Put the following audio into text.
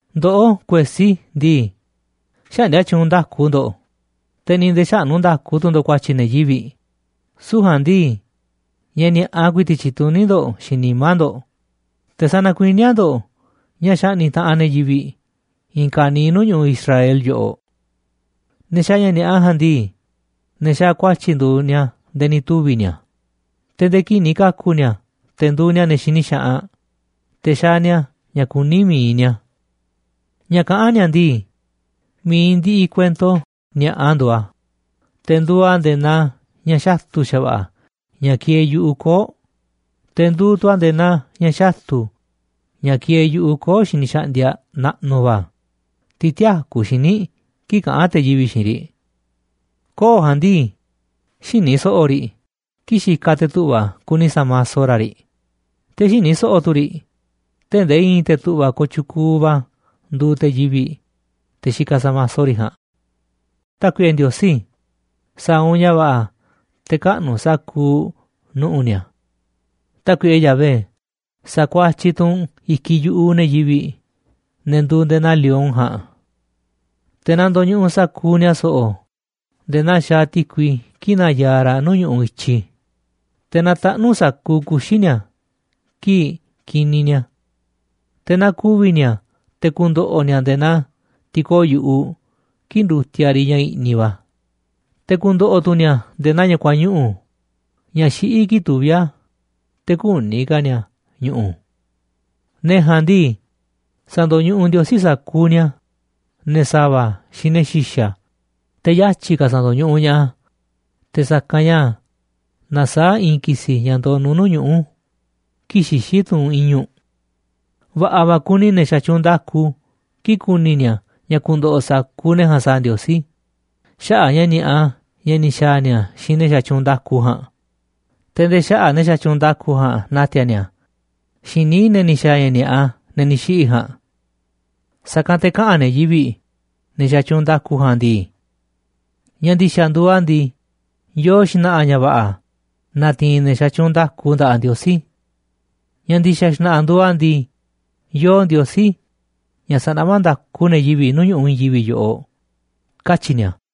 Ndoꞌó, kuesí ndii, xäꞌndia tyuunꞌ nda̱ku ndo̱ꞌ, te̱ ni̱ nde̱e̱ xäꞌnú nda̱ku tu̱ ndo̱ꞌ ku̱a̱tyi̱ ne̱ yivi̱ꞌ. Süu̱ꞌ ja̱a̱nꞌ ndii, ña̱ ni̱a̱ꞌa ku̱i̱ti̱ꞌ tyituní ndo̱ꞌ xiinꞌ nimá ndo̱ꞌ, te̱ sanakuiníá ndo̱ꞌ ña̱ xaꞌni̱ꞌ taꞌanꞌ ne̱ yivi̱ꞌ i̱i̱n ka̱niiꞌ nuu̱ꞌ ñu̱ꞌuꞌ Israel yoꞌoꞌ. Ne̱ xaaꞌ ña̱ ni̱a̱ꞌa ja̱a̱nꞌ ndii, ne̱ xaaꞌ ku̱a̱tyi̱ nduuꞌ ni̱a̱ nde̱e̱ ni̱ tuvi̱ ni̱a̱, te̱ nde̱e̱ kii̱ꞌ ni̱ ka̱ku̱ ni̱a̱ te̱ nduuꞌ ni̱a̱ ne̱ xini xaꞌanꞌ, te̱ xaaꞌ ni̱a̱ ña̱ kuní mi̱iꞌ ni̱a̱. Ña̱ kaꞌán ni̱a̱ ndii, mi̱iꞌ ndiꞌiꞌ kuento ni̱a̱ꞌa nduuꞌ a̱, te̱ nduuꞌ a̱ nde̱e̱ naa ña̱ xatu̱ xa̱va̱ꞌa̱ ña̱ kieeꞌ yu̱ꞌuꞌ koo̱ꞌ, te̱ nduuꞌ tu̱ a̱ nde̱e̱ naa ña̱ xatu̱ ña̱ kieeꞌ yu̱ꞌuꞌ koo̱ꞌ xiniꞌ xaꞌndiaꞌ naꞌnuꞌ va̱, tiꞌ tïakú xíniꞌ kii̱ꞌ kaꞌán te̱ yivi̱ꞌ xiinꞌ riꞌ. Koo̱ꞌ ja̱a̱nꞌ ndii, xïni so̱ꞌo̱ riꞌ kii̱ꞌ xikaꞌ te̱ tu̱ꞌva̱ kuni sa̱maso ra̱ riꞌ, te̱ xïni so̱ꞌo̱ tu̱ riꞌ tee̱ꞌ ndee i̱i̱n te̱ tu̱ꞌva̱ kooꞌ tyukuuꞌ va̱ nduuꞌ te̱ yivi̱ꞌ, te̱ xikaꞌ sa̱maso riꞌ ja̱a̱nꞌ. Tákuiꞌe Ndiosí, sa̱a̱ u̱nꞌ ña̱ va̱ꞌa̱ te̱ kaꞌnu̱ u̱nꞌ sa̱kuuꞌ nu̱ꞌu̱ ni̱a̱. Tákuiꞌe Yahvé, sa̱kuatyiꞌ tu̱ u̱nꞌ i̱kiꞌ yu̱ꞌuꞌ ne̱ yivi̱ꞌ, ne̱ nduuꞌ nde̱e̱ naa lion ja̱a̱nꞌ. Te̱ na ndo̱ñuꞌuꞌ sa̱kuuꞌ ni̱a̱ so̱ꞌo̱ nde̱e̱ naa xaaꞌ ti̱kui kii̱ꞌ nayaaꞌ raꞌ nuu̱ꞌ ñu̱ꞌuꞌ i̱tyi, te̱ na taꞌnu̱ sa̱kuuꞌ kuxi̱ ni̱a̱ kii̱ꞌ kiniꞌ ni̱a̱. Te̱ naa ku̱vi̱ ni̱a̱ te̱ ku̱ndo̱ꞌo̱ ni̱a̱ nde̱e̱ naa ti̱koo̱ꞌ yu̱ꞌuꞌ kii̱ꞌ ndutiaꞌ riꞌ ña̱ i̱ꞌniꞌ va̱, te̱ ku̱ndo̱ꞌo̱ tu̱ ni̱a̱ nde̱e̱ naa ña̱ kuañuꞌu̱ ña̱ xiꞌí kii̱ꞌ tuví a̱, te̱ kü̱ni̱ ka̱ ni̱a̱ ñu̱ꞌu̱. Ne̱ ja̱a̱nꞌ ndii, sa̱ndo̱ñuꞌuꞌ Ndiosí sa̱kuuꞌ ni̱a̱, ne̱ sa̱va̱ xiinꞌ ne̱ xi̱xa̱, te̱ yatyi̱ ka̱ sa̱ndo̱ñuꞌuꞌ ña̱ꞌaꞌ a̱ te̱ sa̱kanꞌ ña̱ nasaáꞌ i̱i̱n ki̱si̱ ña̱ ndonuꞌ nuuꞌ ñuꞌu̱ kii̱ꞌ xixí tunꞌ i̱ñu̱ꞌ. Va̱ꞌa̱ va̱ ku̱ni̱ ne̱ xatyuunꞌ nda̱ku kii̱ꞌ ku̱ni̱ ni̱a̱ ña̱ ku̱ndo̱ꞌo̱ sa̱kuuꞌ ne̱ ja̱a̱nꞌ sa̱a̱ Ndiosí xaꞌa̱ꞌ a̱ ña̱ ni̱a̱ꞌa ña̱ ni̱ xa̱a̱ ni̱a̱ xiinꞌ ne̱ xatyuunꞌ nda̱ku ja̱a̱nꞌ, te̱ nde̱e̱ xaꞌa̱ꞌ ne̱ xatyuunꞌ nda̱ku ja̱a̱nꞌ na̱ti̱a̱ ni̱a̱ xiinꞌ níiꞌ ne̱ ni̱ xa̱a̱ ña̱ ni̱a̱ꞌa, ne̱ ni̱ xiꞌi̱ ja̱a̱nꞌ. Sa̱kanꞌ te̱ kaꞌa̱n ne̱ yivi̱ꞌ, ne̱ xatyuunꞌ nda̱ku ja̱a̱nꞌ ndii: “Ña̱ ndi̱xa̱ nduuꞌ a̱ ndii, yoo xna̱ꞌa̱ ña̱ va̱ꞌa̱ natiinꞌ ne̱ xatyuunꞌ nda̱ku nda̱ꞌaꞌ Ndiosí. Ña̱ ndi̱xa̱ xna̱ꞌa̱ nduuꞌ a̱ ndii, yoo Ndiosí ña̱ sanaꞌmá nda̱ku ne̱ yivi̱ꞌ nuu̱ꞌ ñu̱ꞌuꞌ i̱i̱n yivi̱ꞌ yoꞌoꞌ”, katyi̱ ni̱a̱.